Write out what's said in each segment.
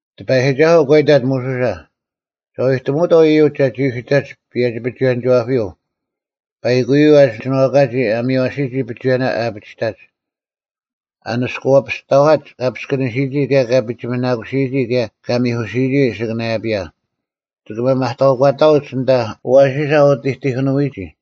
ᑎᐸᔨᒋᒐᓱᐤ ᒂ ᐃᑕᑦ ᒧᓱᓴ, “ᒐ ᐎᑎᒧᐅᑥᐤ ᐃᔪᒡ ᒐᒋ ᐅᓯᑕᒡ ᐸᔭᒋ-ᐱᒍᐎᔭᓂᒋᐛᐱᔪᐤ ᐸᐃᑯᔪᐤ ᐊ ᒋᓏᑲᒋ ᐊ ᒥᔽᓯᔨᒋ ᐱᒍᐎᔭᓇ ᐊ ᐊᐱᒋᑕᒡ, ᐊ ᓂᔅᑯᐛᐱᔅᑕᐛᒡ ᑲ ᐱᔅᑭᓂᓯᔨᒋ ᑭᔭ ᑲ ᐱᒋᒥᓇᑯᓯᔨᒋ ᑭᔭ ᑲ ᒥᐧᑯᓯᔨᒋ ᐊᓯᑭᓇᔭᐱᔭ᙮ ᒋᑭ ᒥᒪᑕᐅᒂᑕᐅᒡ ᐊᓐᑕ ᐊᐛᓯᓴ ᐊ ᐅᑎᑎᑭᓄᐎᒋ᙮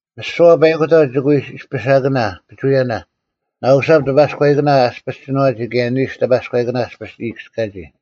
ᒥᓯᐛ ᐸᐃᑯᑕᐤ ᒋᑭ ᐎ ᐃᔅᐱᓴᑭᓇ ᐱᒍᐎᔭᓇ: ᓇᐅᓴᑉ ᑎᐸᔎᐃᑭᓇ ᐊᔅᐱᔅ ᒋᓏᒋ ᑭᔭ ᓂᓱ ᑎᐸᔎᐃᑭᓇ ᐊᔅᐱᔅ ᐃᔨᑭᔅᑲᔨᒋ᙮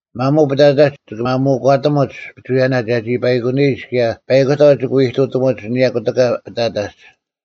ᒪᒧᐤ ᐱᑕᑕᒡ ᒋᑭ ᒪᒧᒂᑎᒧᒡ ᐱᒍᐎᔭᓇ ᒐᒋ ᐸᐃᑯᓂᔨᒡ ᑭᔭ ᐸᐃᑯᑕᐤ ᒋᑭ ᐃᑐᑎᒧᒡ ᐊᓂᔭ ᑯᑎᑲ ᐱᑕᑕᒡ᙮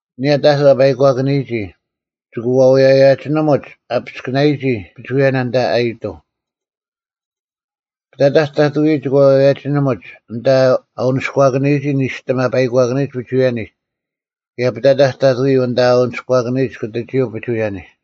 ᐊᓂᔭ ᑕᑐᐤ ᐊ ᐸᐃᒂᑭᓂᔨᒋ, ᒋᑭ ᐛᐅᔭᔭᐸᒋᓂᒧᒡ ᐊ ᐱᔅᑭᓇᔨᒋ ᐱᒍᐎᔭᓇ ᐊᓐᑕ ᐊᔨᑐᐤ᙮ ᐱᑕᑕᒡ ᑕᑐᔪᐤ ᒋᑭ ᐛᐅᔭᔭᐸᒋᓂᒧᒡ ᐊᓐᑕ ᐊ ᐅᓂᔎᑭᓂᔨᒋ ᓂᔅᑎᒻ ᐊ ᐸᐃᒂᑭᓂᔨᒡ ᐱᒍᐎᔭᓂᒡ ᑭᔭ ᐱᑕᑕᒡ ᑕᑐᔪᐤ ᐊᓐᑕ ᐊ ᐅᓂᔎᑭᓂᔨᒡ ᑯᑎᒋᔪᐤ ᐱᒍᐎᔭᓂᒡ᙮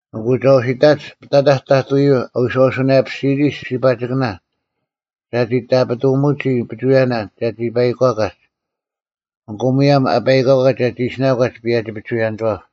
ᐊᑯ ᒐ ᐛᓯᑕᒡ ᐱᑕᑕᒡ ᑕᑐᔪᐤ ᐊ ᐎᔄᐅᓱᓇᔭᐱᓯᔨᒋ ᓯᒋᐸᒋᑭᓇ ᒐᒋ ᑕᐱᑐᒧᒋ ᐱᒍᐎᔭᓇ ᒐᒋ ᐸᐃᒂᑲᒡ, ᐊᑯ ᒧᔭᒻ ᐊ ᐸᐃᒂᒡ ᒐᒋ ᐃᓯᓇᒂᒡ ᐸᔭᒋ-ᐱᒍᐎᔭᓂᒋᐛᑉ᙮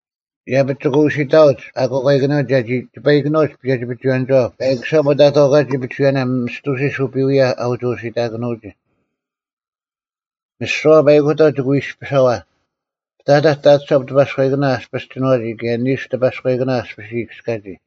ᐃᔭᐱᒡ ᒋᑭ ᐅᓯᑕᐅᒡ ᐊᑯᐛᑲᐃᑭᓂᔪᐤ ᒐᒋ ᒋᐸᐃᑭᓄᐅᒡ ᐸᔭᒋ-ᐱᒍᐎᔭᓂᒋᐛᑉ ᐸᐃᑯᓴᑉ ᐊᑕᑥᑲᒋ ᐱᒍᐎᔭᓇ ᒥᔅᑐᓯᔅ ᐅᐱᐎᔭ ᐊ ᐅᒋ ᐅᓯᑕᑭᓄᐅᒋ᙮ ᒥᓯᐛ ᐸᐃᑯᑕᐤ ᒋᑭ ᐎ ᐃᔅᐱᓴᐛ: ᐱᑕᑕᒡ ᑕᑐᓴᑉ ᑎᐸᔎᐃᑭᓇ ᐊᔅᐱᔅ ᒋᓏᒋ ᑭᔭ ᓂᓱ ᑎᐸᔎᐃᑭᓇ ᐊᔅᐱᔅ ᐃᔨᑭᔅᑲᒋ᙮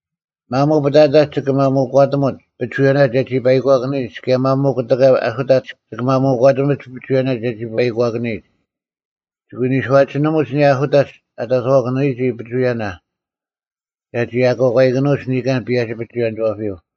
ᒪᒧᐤ ᐱᑕᑕᒡ ᒋᑭ ᒪᒧᒂᑎᒧᒡ ᐱᒍᐎᔭᓇ ᒐᒋ ᐸᐃᒂᑭᓂᔨᒡ ᑭᔭ ᒪᒧᐤ ᑯᑎᑲ ᐊᓱᑕᒡ ᒋᑭ ᒪᒧᒂᑎᒧᒡ ᐱᒍᐎᔭᓇ ᒐᒋ ᐸᐃᒂᑭᓂᔨᒡ᙮ ᒋᑭ ᐎ ᓂᔄᒋᓂᒧᒡ ᐊᓂᔭ ᐊᓱᑕᒡ ᐊᑕᑥᑭᓂᔨᒋ ᐱᒍᐎᔭᓇ ᒐᒋ ᐊᑯᓇᐃᑭᓄᐎᒡ ᓂᑲᓐ ᐸᔭᒋ-ᐱᒍᐎᔭᓂᒋᐛᐱᔪᐤ᙮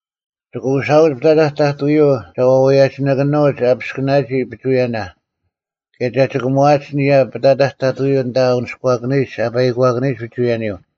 ᒋᑭ ᐅᓴᐅᒡ ᐱᑕᑕᒡ ᑕᑐᔪᐤ ᒐ ᐛᐅᔭᔭᐸᒋᓇᒡ ᐊᐱᔅᑭᓇᔨᒋ ᐱᒍᐎᔭᓇ ᑭᔭ ᒐ ᒋᑭᒺᐊᒡ ᐊᓂᔭ ᐱᑕᑕᒡ ᑕᑐᔪᐤ ᐊᓐᑕ ᐊ ᐅᓂᔎᓂᔨᒡ ᐊ ᐸᐃᒂᑭᔨᒡ ᐱᒍᐎᔭᓂᔪᐤ᙮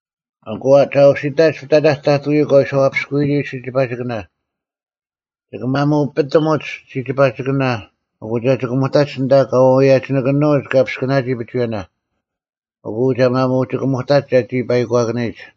ᐊᑯ ᒐ ᐛᓯᑕᒡ ᐱᑕᑕᒡ ᑕᑐᔪᐤ ᑲ ᐎᔄᐛᐱᔅᑯᔨᒋ ᓯᒋᐸᒋᑭᓇ᙮ ᒋᑭ ᒪᑯᐱᑎᒧᒡ ᓯᒋᐸᒋᑭᓇ ᐊᑯ ᒐ ᒋᑭᒧᑕᒡ ᐊᓐᑕ ᑲ ᐛᐅᔭᔭᐸᒋᓇᒡ ᑲ ᐱᔅᑭᓇᔨᒋ ᐱᒍᐎᔭᓇ, ᐊᑯ ᒐ ᒪᒧᒋᑭᒧᑕᒡ ᒐᒋ ᐸᐃᒂᑭᓂᔨᒡ᙮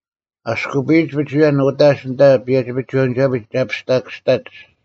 ᐊᔅᑯᐱᔨᒡ ᐱᒍᐎᔭᓐ ᐅᑕᒡ ᐊᓐᑕ ᐸᔭᒋ-ᐱᒍᐎᔭᓂᒋᐛᐱᒡ ᒐ ᐱᔅᑕᑭᔅᑕᒡ᙮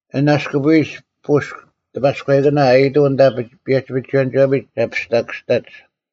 ᐊᓐ ᐊᔅᑯᐱᔨᒡ ᐳᔅᒄ ᑎᐸᔎᐃᑭᓇ ᐊᔨᑐᐤ ᐊᓐᑕ ᐸᔭᒋ-ᐱᒍᐎᔭᓂᒋᐛᐱᒡ ᒐ ᐱᔅᑕᑭᔅᑕᒡ᙮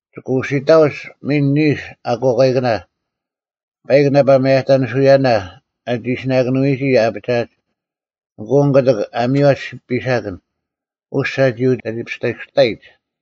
ᒋᑭ ᐅᓯᑕᐅᒡ ᒥᓐ ᓂᓱ ᐊᑯᓇᐃᑭᓇ᙮ ᐸᐃᒄ ᓇᐸ ᒪᔭᑕᓂᓱᐎᔭᓇ ᐊ ᒋᓯᓇᑭᓄᔨᒋ ᐊᐱᒋᐊᒡ᙮ ᐊᑯ ᐊᓐ ᑯᑎᒃ ᐊ ᒥᔽᒡ ᐱᓴᑭᓐ, ᐅᔅᒡ ᒐᒋ ᐅᒋ ᐱᔅᑕᑭᔅᑕᔨᒡ᙮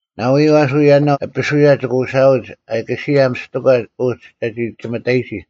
ᓇᐎᔪᐤ ᐊᓱ ᔭᓇᐤ ᐊᐱᓱᔭ ᒋᑭ ᐅᓴᐅᒡ ᐊᑲᓯᔭ ᒥᔅᑎᒂ ᐅᒋ ᒐᒋ ᒋᒥᑕᔨᒋ᙮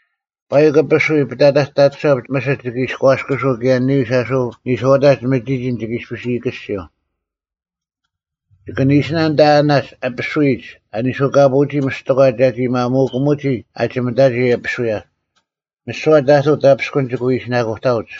ᐸᐃᒄ ᐊᐱᓱᔾ ᐱᑕᑕᒡ ᑕᑐᓴᑉ ᒥᓯᑦ ᒋᑭ ᐃᔎᔅᑯᓱᐤ ᑭᔭ ᓂᓱᔪᐤ ᐊᓱ ᓂᔄᐅᑕᒡ ᒥᒋᒋᓐ ᒋᑭ ᐃᔅᐱᔅ ᐃᔨᑭᔅᒋᔪᐤ᙮ ᒋᑭ ᓂᓯᓇ ᐊᓐᑕ ᐊᓇᒡ ᐊᐱᓱᔨᒡ ᐊ ᓂᓱᑲᐳᐅᒋ ᒥᔅᑎᒂ ᒐᒋ ᒪᒧᑭᒧᒋ ᐊᒋᒥᑕᒋ ᐊᐱᓱᔭ᙮ ᒥᓯᐛ ᑕᑐᐤ ᑕᐱᔅᑯᓐ ᒋᑭ ᐎ ᐃᓯᓇᑯᑕᐅᒡ᙮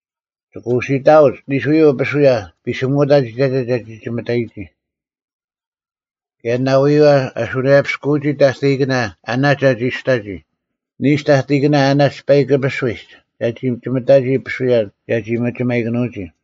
ᒋᑭ ᐅᓯᑕᐅᒡ ᓂᓱᔪᐤ ᐊᐱᓱᔭ ᐱᓯᒧᑕᒡ ᐃᑕᒐ ᒐᒋ ᒋᒥᑕᒋ᙮ ᑭᔭ ᓇᐎᔪᐤ ᐊ ᓱᓇᔭᐱᔅᑯᔨᒋ ᑕᑕᐃᑭᓇ ᐊᓇᒡ ᒐᒋ ᐊᔅᑕᒋ, ᓂᓱ ᑕᑕᐃᑭᓇ ᐊᓇᒡ ᐸᐃᒄ ᐊᐱᓱᔨᒡ ᒐᒋ ᒋᒥᑕᒋ ᐊᐱᓱᔭ ᒐᒋ ᒥᒋᒪᔨᑭᓄᔨᒋ᙮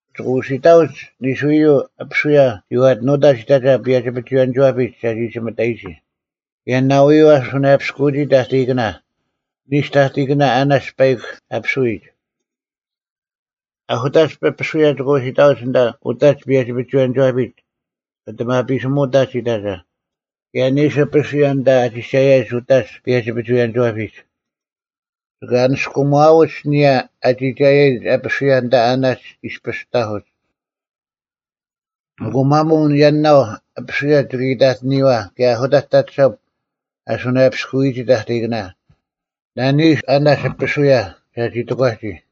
ᒋᑭ ᐅᓯᑕᐅᒡ ᓂᓱᔪᐤ ᐊᐱᓱᔭ ᒋᐛᑎᓄᑕᒡ ᐃᑕᒐ ᐸᔭᒋ-ᐱᒍᐎᔭᓂᒋᐛᐱᒡ ᒐᒋ ᒋᒥᑕᔨᒋ ᑭᔭ ᓇᐎᔪᐤ ᐊ ᓱᓇᔭᐱᔅᑯᔨᒋ ᑕᑕᐃᑭᓇ, ᓂᓱ ᑕᑕᐃᑭᓇ ᐊᓇᒡ ᐸᐃᒄ ᐊᐱᓱᔨᒡ᙮ ᐊᓱᑕᒡ ᐊᐱᓱᔭ ᒋᑭ ᐅᓯᑕᐅᒡ ᐊᓐᑕ ᐅᑕᒡ ᐸᔭᒋ-ᐱᒍᐎᔭᓂᒋᐛᐱᒡ, ᐊᑎᒪᐱᓯᒧᑕᒡ ᐃᑕᒐ, ᑭᔭ ᓂᓱ ᐊᐱᓱᔭ ᐊᓐᑕ ᐊ ᒋᒐᔭᒡ ᐅᑕᒡ ᐸᔭᒋ-ᐱᒍᐎᔭᓂᒋᐛᐱᒡ᙮ ᒋᑭ ᐊᓂᔅᑯᒺᐅᒡ ᐊᓂᔭ ᐊ ᒋᒐᔭᔨᒡ ᐊᐱᓱᔭ ᐊᓐᑕ ᐊᓇᒡ ᐃᔅᐱᔅ ᑕᐧᑯᒡ᙮ ᐊᑯ ᒪᒧᐤ ᔭᓇᐤ ᐊᐱᓱᔭ ᒋᑭ ᐃᑕᑎᓂᔨᐛ ᑭᔭ ᐊᓱᑕᒡ ᑕᑐᓴᑉ ᐊ ᓱᓇᔭᐱᔅᑯᔨᒋ ᑕᑕᐃᑭᓐ, ᓇᓂᓱ ᐊᓇᒡ ᐊᐱᓱᔭ ᒐᒋ ᑎᒂᒋ᙮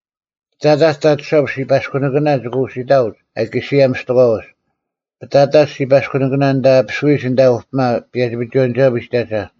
ᐱᑕᑕᒡ ᑕᑐᓴᑉ ᓯᐸᔅᑯᓂᑭᓇ ᒋᑭ ᐅᓯᑕᐅᒡ ᐊᑲᓯᔭ ᒥᔅᑎᒂ ᐅᒡ, ᐱᑕᑕᒡ ᓯᐸᔅᑯᓂᑭᓇ ᐊᓐᑕ ᐊᐱᓱᔨᒡ ᐊᓐᑕ ᐅᐱᒪ ᐸᔭᒋ-ᐱᒍᐎᔭᓂᒋᐛᐱᒡ ᐃᑕᒐ,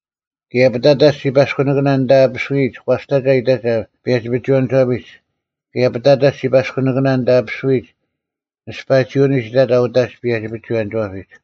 ᑭᔭ ᐱᑕᑕᒡ ᓯᐸᔅᑯᓂᑭᓇ ᐊᓐᑕ ᐊᐱᓱᔨᒡ ᒂᔅᑕᒐ ᐃᑕᒐ ᐸᔭᒋ-ᐱᒍᐎᔭᓂᒋᐛᐱᒡ᙮ ᑭᔭ ᐱᑕᑕᒡ ᓯᐸᔅᑯᓂᑭᓇ ᐊᓐᑕ ᐊᐱᓱᔨᒡ ᓂᔅᐸᒋᐅᓂᒡ ᐃᑕᒐ ᐅᑕᒡ ᐸᔭᒋ-ᐱᒍᐎᔭᓂᒋᐛᐱᒡ᙮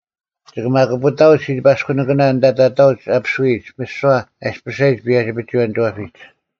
ᒋᑭ ᒪᑯᐱᑕᐅᒡ ᓯᐸᔅᑯᓂᑭᓇ ᐊᓐᑕ ᑕᑕᐅᒡ ᐊᐱᓱᔨᒡ ᒥᓯᐛ ᐊᔅᐱᓴᔨᒡ ᐸᔭᒋ-ᐱᒍᐎᔭᓂᒋᐛᐱᒡ᙮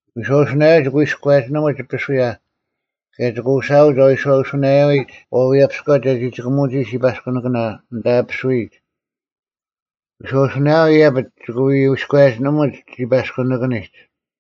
ᐎᔄᐅᓱᓇᔭᐤ ᒋᑭ ᐎᔎᔭᒋᓂᒧᒡ ᐊᐱᓱᔭ ᑭᔭ ᒋᑭ ᐅᓯᐊᐅᒡ ᐊ ᐎᔄᐅᓱᓇᔭᔨᒡ ᐛᐎᔭᐱᔎ ᒐᒋ ᒋᑭᒧᒋ ᓯᐸᔅᑯᓂᑭᓇ ᐊᓐᑕ ᐊᐱᓱᔨᒡ᙮ ᐎᔄᐅᓱᓇᔭᔪᐤ ᐃᔭᐱᒡ ᒋᑭ ᐎᔎᔭᒋᓂᒧᒡ ᓯᐸᔅᑯᓂᑭᓂᒡ᙮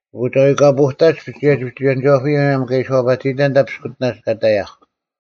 ᐊᑯ ᒐ ᐎᑲᐳᑕᒡ ᐸᔭᒋ-ᐱᒍᐎᔭᓂᒋᐛᐱᔪᐤ ᒧᔭᒻ ᑲ ᐃᓯ ᐛᐸᑎᔨᑕᓐ ᐊᓐᑕ ᐱᔅᑯᑎᓇᒡ ᑲ ᑕᔭᐧᒄ᙮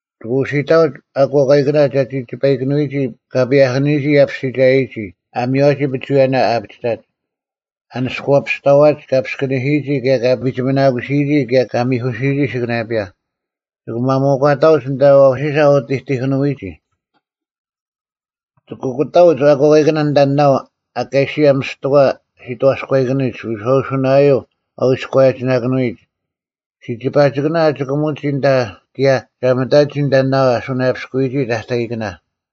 ᒋᑭ ᐅᓯᑕᐅᒡ ᐊᑯᐛᑲᐃᑭᓇ ᒐᒋ ᒋᐸᐃᑭᓄᔨᒋ ᑲ ᐸᔭᐧᑭᓂᔨᒋ ᐊᔅᐱᔅᒋᒐᔨᒋ ᐊ ᒥᔽᓯᔨᒋ ᐱᒍᐎᔭᓇ ᐊ ᐊᐱᒋᑕᒡ, ᐊ ᓂᔅᑯᐛᐱᔅᑕᐛᒡ ᑲ ᐱᔅᑭᓂᓯᔨᒋ ᑭᔭ ᑲ ᐱᒋᒥᓇᑯᓯᔨᒋ ᑭᔭ ᑲ ᒥᐧᑯᓯᔨᒋ ᐊᓯᑭᓇᔭᐱᔭ᙮ ᒋᑭ ᒥᒪᑕᐅᒂᑕᐅᒡ ᐊᓐᑕ ᐊᐛᓯᓴ ᐊ ᐅᑎᑎᑭᓄᐎᒋ᙮ ᒋᑭ ᐊᑯᑕᐅᒡ ᐊᑯᐛᑲᐃᑭᓇ ᐊᓐᑕ ᓇᐤ ᐊᑲᓯᐊ ᒥᔅᑎᒂ ᓯᑥᔎᐃᑭᓂᒡ ᐎᔄᐅᓱᓇᔭᐤ ᐊ ᐎᔎᔭᒋᓇᑭᓄᔨᒡ, ᓯᒋᐸᒋᑭᓇ ᐊ ᒋᑭᒧᒋ ᑭᔭ ᒐᒥᑕᒋ ᐊᓐᑕ ᓇᐤ ᐊ ᓱᓇᔭᐱᔅᑯᔨᒋ ᑕᑕᐃᑭᓇ᙮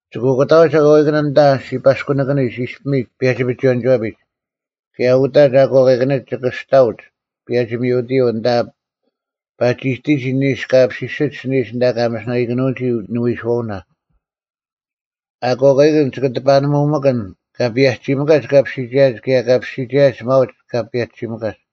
ᒋᑭ ᐊᑯᑕᐅᒡ ᐊᑯᐛᑲᐃᑭᓇ ᐊᓐᑕ ᓯᐸᔅᑯᓂᑭᓂᒡ ᐃᔅᐱᒥᒡ ᐸᔭᒋ-ᐱᒍᐎᔭᓂᒋᐛᐱᒡ, ᑭᔭ ᐅᑕᒡ ᐊᑯᐛᑲᐃᑭᓂᒡ ᒋᑭ ᐊᔅᑕᐅᒡ ᐸᔭᒋ-ᒥᐅᑎᔪᐤ ᐊᓐᑕ ᐸᒋᑎᒋ ᓂᓱ ᑲ ᐱᐱᒋᓯᒡ ᐊᓯᓂᔨᒡ ᐊᓐᑕ ᑲ ᒥᓯᓇᐃᑭᓄᐅᒋ ᓂᐎᓱᐛᐅᓇ᙮ ᐊᑯᐛᑲᐃᑭᓐ ᒋᑭ ᑎᐸᓂᒧᒥᑭᓐ ᑲ ᐸᔭᒋᒥᑲᒡ ᑲᐱᔅᒋᒐᔭᒡ ᑭᔭ ᑲᐱᔅᒋᒐᔭᒡ ᒪᐅᒡ ᑲ ᐸᔭᒋᓯᒥᑲᒡ᙮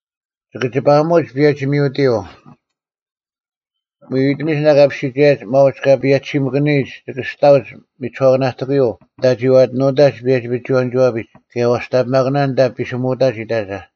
ᒋᑭ ᒋᐸᐊᒧᒡ ᐸᔭᒋ-ᒥᐅᑎᔪᐤ᙮ ᐎᐎᑎᒥᒡ ᐊᓐᑕ ᑲᐱᔅᒋᒐᔭᔨᒡ ᒪᐅᒡ ᑲ ᐸᔭᒋᓯᒥᑭᓂᔨᒡ ᒋᑭ ᐊᔅᑕᐅᒡ ᒥᒋᓱᐛᑭᓇᑎᑯᔪᐤ ᐊᓐᑕ ᒋᐛᑎᓄᑕᒡ ᐸᔭᒋ-ᐱᒍᐎᔭᓂᒋᐛᐱᒡ ᑭᔭ ᐛᔅᑕᓂᐱᒪᑭᓇᑎᒂ ᐊᓐᑕ ᐱᓯᒧᑕᒡ ᐃᑕᒐ᙮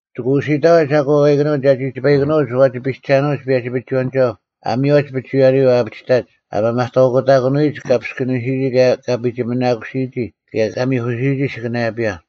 ᒋᑭ ᐅᓯᑕᐅᒡ ᐊᑯᐛᑲᐃᑭᓂᔪᐤ ᒐᒋ ᒋᐸᐃᑭᓄᐅᒡ ᐛᒋ ᐱᒐᓄᐅᒡ ᐸᔭᒋ-ᐱᒍᐎᔭᓂᒋᐛᑉ ᐊ ᒥᔽᔨᒡ ᐱᒍᐎᔭᓂᔪᐤ ᐊ ᐊᐱᒋᑕᒡ ᐊ ᒥᒪᑕᐅᒂᑕᑭᓄᔨᒡ ᑲ ᐱᔅᑭᓂᓯᔨᒋ ᑭᔭ ᑲ ᐱᒋᒥᓇᑯᓯᔨᒋ ᑭᔭ ᑲ ᒥᐧᑯᓯᔨᒋ ᐊᓯᑭᓇᔭᐱᔭ᙮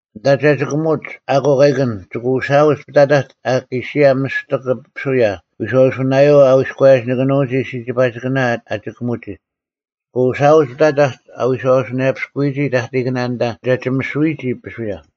ᐊᓐᑕ ᒐᒋᑭᒧᒡ ᐊᑯᐛᑲᐃᑭᓐ, ᒋᑭ ᐅᓯᐊᐅᒡ ᐱᑕᑕᒡ ᐊᑲᓯᐊ ᒥᔅᑎᒄ ᐊᐱᓱᔭ ᐎᔄᐅᓱᓇᔭᔪᐤ ᐊ ᐎᔎᔭᒋᓇᑭᓄᔨᒋ ᓯᒋᐸᒋᑭᓇ ᐊ ᒋᑭᒧᔨᒋ; ᒋᑭ ᐅᓯᐊᐅᒡ ᐱᑕᑕᒡ ᐊ ᐎᔄᐛᐱᔅᑯᔨᒋ ᑕᑕᐃᑭᓇ ᐊᓐᑕ ᒐ ᒋᒥᓱᔨᒋ ᐊᐱᓱᔭ᙮”